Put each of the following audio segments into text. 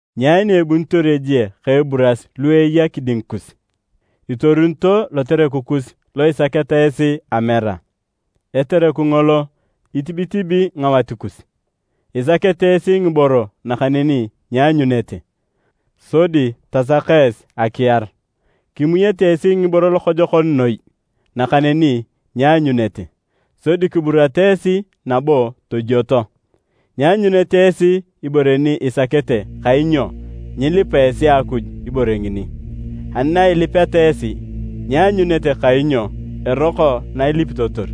Nyai ni ebunitor ejie ka eburas lu eya kiding kus? Itorunito lotereku kus lo isaketa esi amera, etereku ngolo itibitibi ngawat kus. Isakete esi ngiboro nakaneni nyianyunete, sodi tasaka esi akiar. Kimuyete esi ngiboro lokojokon noi, nakaneni nyianyunete, sodi kiburata esi nabo tojwoto. Nyianyunete esi ibore ni isakete kainyo nyilipa esi Akuj ibore ngini. Ani na ilipeta esi, nyianyunete kainyo eroko na ilipitotor,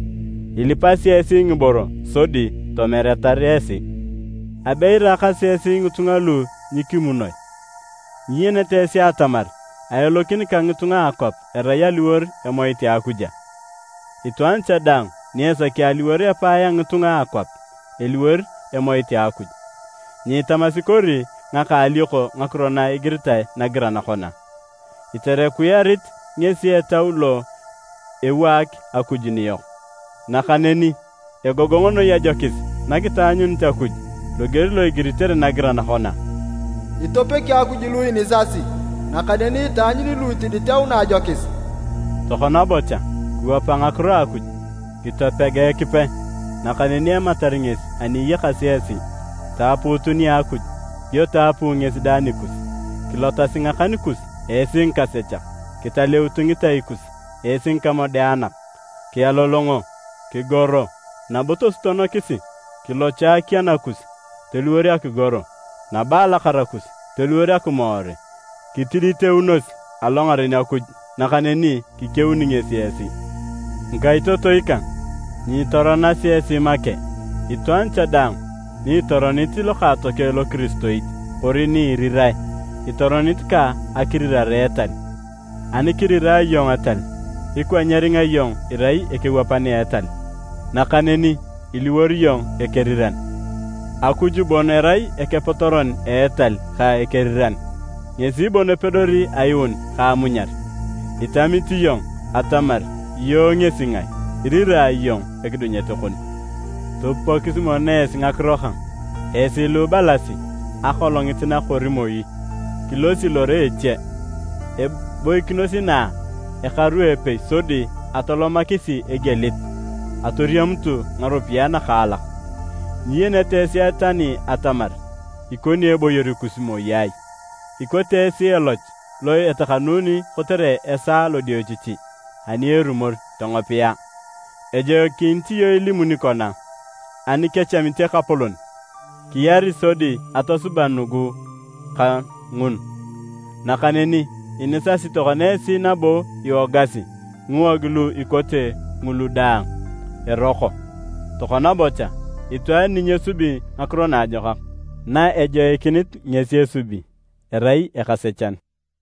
ilipasi esi ngiboro sodi tomeratar esi. Abe iraakasi esi ngitunga lu nyikimunoi! Nyiyenete esi atamar aelokin ka ngitunga a akwap erai aliwor emoit a Akuj a? Itwaan cha daang ni esaki aliwor epae a ngitunga a akwap, eliwor emoit a Akuj. Nyiitamasi kori ngaka alioko ngakiro na igiritae nagiran kona, “Iterekuyarit ngesi Etau lo ewaak Akuj niyok.” Nakaneni egogong noi ajokis na kitaanyunit Akuj, loger lo igiritere nagiran kona, “Itopegi Akuj lu inisasi, nakaneni itaanyuni lu itiditeuna ajokis.” Tokona bocha, kiwapa ngakiro a Akuj. Kitopega Ekipe, nakaneni ematar ngesi ani iyakasi esi. Taapuutu nia Akuj, dio taapuu ngesi dang nikus. Kilotasi ngakan kus esi ngikasechak! Kitaleutu ngitai kus esi ngikamodeanak! Kialolongo, kigoro nabo tosutonokis, kilocho akiana kus toliwor akigoro, nabo alakara kus toliwor akimoore! Kitiditeunos alongaren Akuj, nakaneni kikeuni ngesi esi. Ngikaitotoi kang! Nyiitoronasi esi make. Itwaan cha daang ni itoronit lokaatokeng lokiristoit kori ni irirae, itoronit ka akirirare etal. Ani kirirae iyong etal, ikwa nyeringa iyong irai ekewapan etal, nakaneni iliwor iyong ekeriran. Akuj bon erai akepotoron a etal ka akeriran. Ngesi bon epedori ayuun ka amunyar. Itamit iyong atamar iyong ngesi ngae, iriraa iyong ekidunyet kon? Topupokisi mono esi ngakiro kang, esi lu ibalasi, “Akolongit na kori moi, kilosi lore eche, eboikinos inaa ekaru epei sodi atolomakisi egielit, atoriamutu ngaropiyae nakaalak.” Nyiyenete esi tani atamar ikokini eboyor kus moi ai! Ikote esi eloch lo etakanuni kotere esaa lodiochichi ani erumor tongopiya. Ejoikinit iyong ilimuni kona, “Ani kechamit Ekapolon, kiyari sodi atosuba nugu ka ngun.” Nakaneni inisasi tokona esi nabo iwogasi, ngiwog lu ikote ngulu daang, eroko. Tokona bocha, itwaan ni nyesubi ngakiro naajokak na ejoikinit ngesi esubi, erai ekasechan.